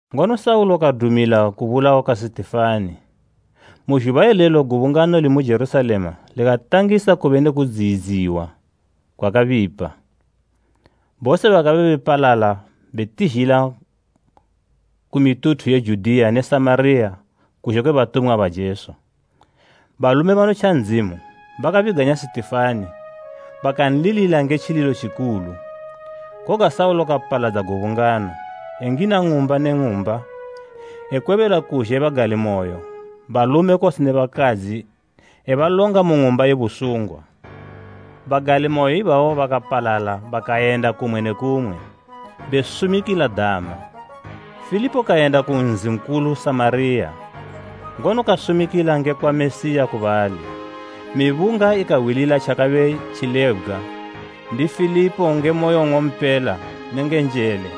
Ngono Saulo kadumila kubulawa kwa Sitifani. Saulo edziyidza Gubungano Mu zhuba ilelo gubungano limu Jerusalema likatangisa kube ne kudziyidziwa kwakabipa. Bose bakabe bepalala betizhila ku mituthu ye Judiya ne Samariya kuzhe kwe batumwa ba Jesu. Balume banotja Ndzimu, bakabiganya Sitifani, bakanlilila nge tjililo tjikulu. Koga Saulo kapaladza gubungano, engina ng'umba ne ng'umba ekwebela kuzhe bagalimoyo, balume kose ne bakadzi ebalonga mu ng'umba ye busungwa. Bagalimoyo ibabo bakapalala bakayenda kumwe ne kumwe, besumikila dama. Filipo kayenda ku nzi nkulu Samariya, ngono kasumikila ngekwa Mesiya ku bali. Mibunga ikahwilila tjakabe tjilebgwa ndi Filipo nge moyo nng'ompela nenge njele,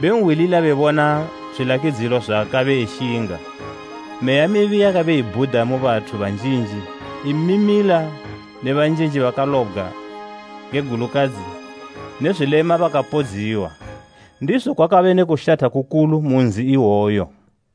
benhwilila bebona zwilakidzo zwaakabe eshinga. Meya mibi yakabe ibhuda mu bathu banjinji imimila ne banjinji bakalobgwa nge gulukadzi ne zwilema bakapodziwa. Ndizo kwakabe ne kushatha kukulu mu nzi iwoyo.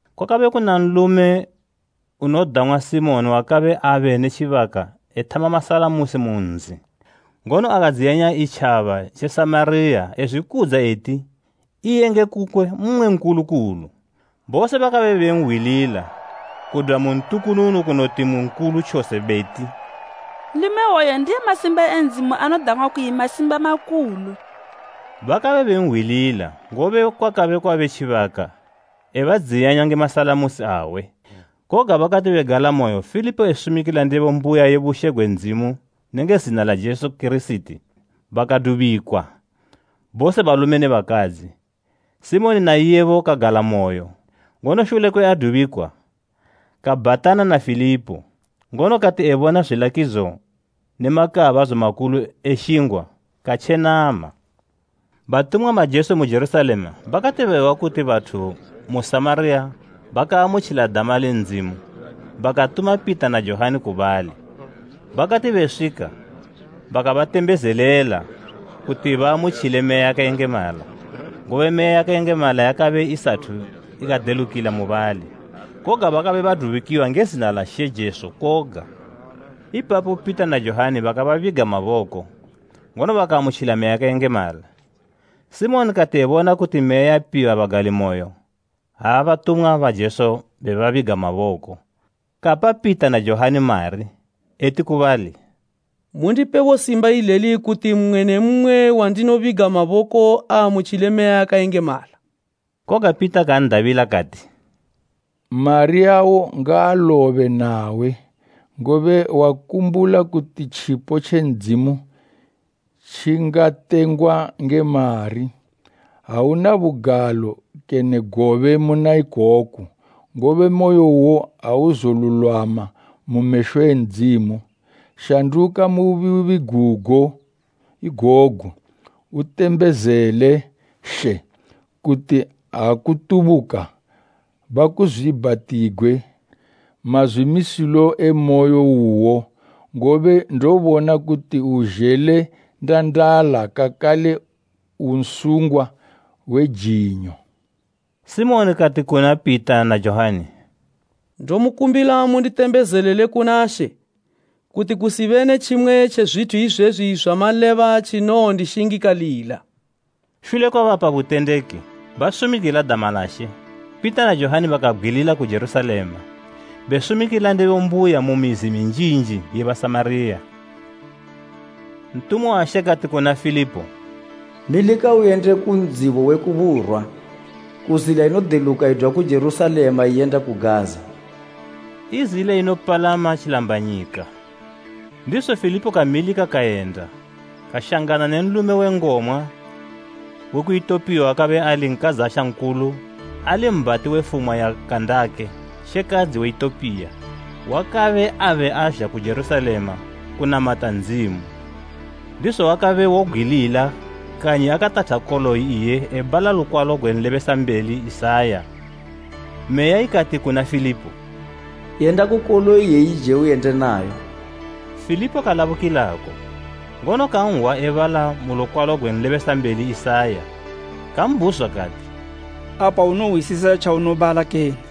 Kwakabe kuna nlume unodang'wa Simoni wakabe abe ne tjibaka ethama masalamusi mu nzi ngono akadziyanya itjaba tje Samariya ezwikudza eti iye nge kukwe mmwe nkulu kulu. Bose bakabe benhwilila kudwa mu ntukununu kunoti mu nkulu tjose beti, “Nlume iwoyu ndiye masimba e Ndzimu anodang'wa kuyi masimba makulu.” Bakabe benhwilila, ngobe kwakabe kwabe tjibaka ebadziyanya nge masalamusi awe. Koga bakati begalamoyo Filipo esumikila ndebo mbuya ye bushe gwe Ndzimu nenge zina la Jesu Kirisiti, bakadubikwa, bose balume ne bakadzi. Simoni na iyebo kagalamoyo, ngono shule kwe adubikwa, kabhatana na Filipo. Ngono kati ebona zwilakidzo ne makaabadzo makulu eshingwa katjenama. Batumwa ba Jesu mu Jerusalema bakati behwa kuti bathu mu Samariya bakaamutjila dama le Ndzimu, bakatuma Pita na Johani ku bali. Bakati beswika, bakabatembezelela kuti baamutjile Meya yakayengemala. Ngobe Meya yakayengemala yakabe isathu ikadelukila mubali, koga bakabe badubikiwa nge zina la She Jesu koga. Ipapo Pita na Johani bakababiga maboko, ngono bakaamutjila Meya yakayengemala. Simoni kati ebona kuti Meya yapiwa bagalimoyo ha batumwa ba Jesu bebabiga maboko, kapa Pita na Johani mari, eti ku bali, “Mundipebo simba ileli, kuti mmwe ne mmwe wandinobiga maboko aamutjile Meya yakayengemala.” Koga Pita kan'dabila kati, “Mari awo ngaalobe nawe, ngobe wakumbula kuti tjipo tje Ndzimu tjingatengwa nge mari! Auna bugalo kene gobe muna ikoku, ngobe moyo uwo auzolulwama mu mesho e Ndzimu. Shanduka mu bubi gugo igogu, utembezele She, kuti, ha kutubuka bakuzwiibhatigwe mazwimisilo e moyo uwo. Ngobe ndobona kuti uzhele ndandala kakale u nsungwa we jinyo.” Simoni kati kuna Pita na Johani, “Ndomukumbila munditembezelele kuna She, kuti kusibe ne tjimwe tje zwithu izwezwi zwamaleba tjinowondishingikalila.” Shule kwe bapa butendeki, basumikila dama la She, Pita na Johani bakabgwilila ku Jerusalema, besumikila ndebo mbuya mu mizi minjinji ye Basamariya. Ntumwa wa She kati kuna Filipo, “Milika uyende ku ndzibo we ku burwa ku zila inodeluka idwa ku Jerusalema iyenda ku Gaza.” I zila inopalama tjilambanyika. Ndizo Filipo kamilika kayenda, kashangana ne nlume we ngomwa we ku Itopiya wakabe ali nkadzasha nkulu ali mbhati we fumwa ya Kandake shekadzi we Itopiya, wakabe abe azha ku Jerusalema kunamata Ndzimu. Ndizo wakabe wobgwilila kanyi akatatha koloyi iye ebala lukwalo gwe nlebesambeli Isaya. Meya ikati kuna Filipo, “Yenda ku koloyi iyeyije uyende nayo.” Filipo kalabukilako, ngono kanhwa ebala mu lukwalo gwe nlebesambeli Isaya. Kambhuzwa kati, “Apa unohwisisa tjaunobala kene?”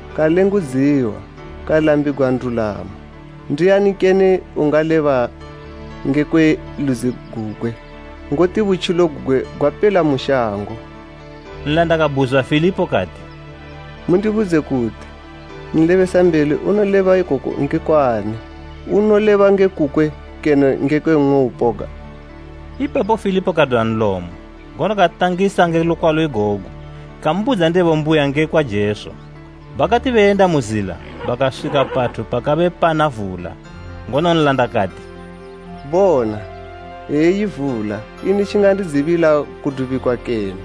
Kalengudziwa kalambigwa ndulamo. Ndiani kene ungaleba ngekwe ludzi gugwe? Ngoti butjilo gugwe gwapela mu shango.” Nlanda kabhuzwa Filipo kati, “Mundibudze kuti, nlebesambeli unoleba ikoku ngekwa ani? Unoleba nge kukwe kene ngekwe mmwe upoga?” Ipapo Filipo kadwa nlomo, ngono katangisa nge lukwalo igogu, kambudza ndebo mbuya ngekwa Jesu. Bakati beyenda mu zila, bakaswika pathu pakabe pana vula, ngono nlanda kati, “Bona, eyi vula. Ini tjingandidzibila kudubikwa kene?”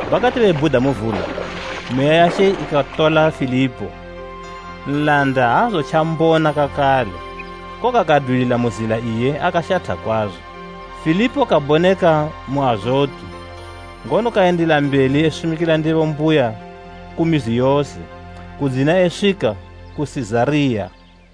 Bakati bebhuda mu vula, Meya ya She ikatola Filipo. Nlanda aazotjambona kakale, koga kadwilila mu zila iye akashatha kwazo. Filipo kaboneka mu Azotu; ngono kayendila mbeli esumikila ndebo mbuya ku mizi yose, kudzina eswika ku Sizariya.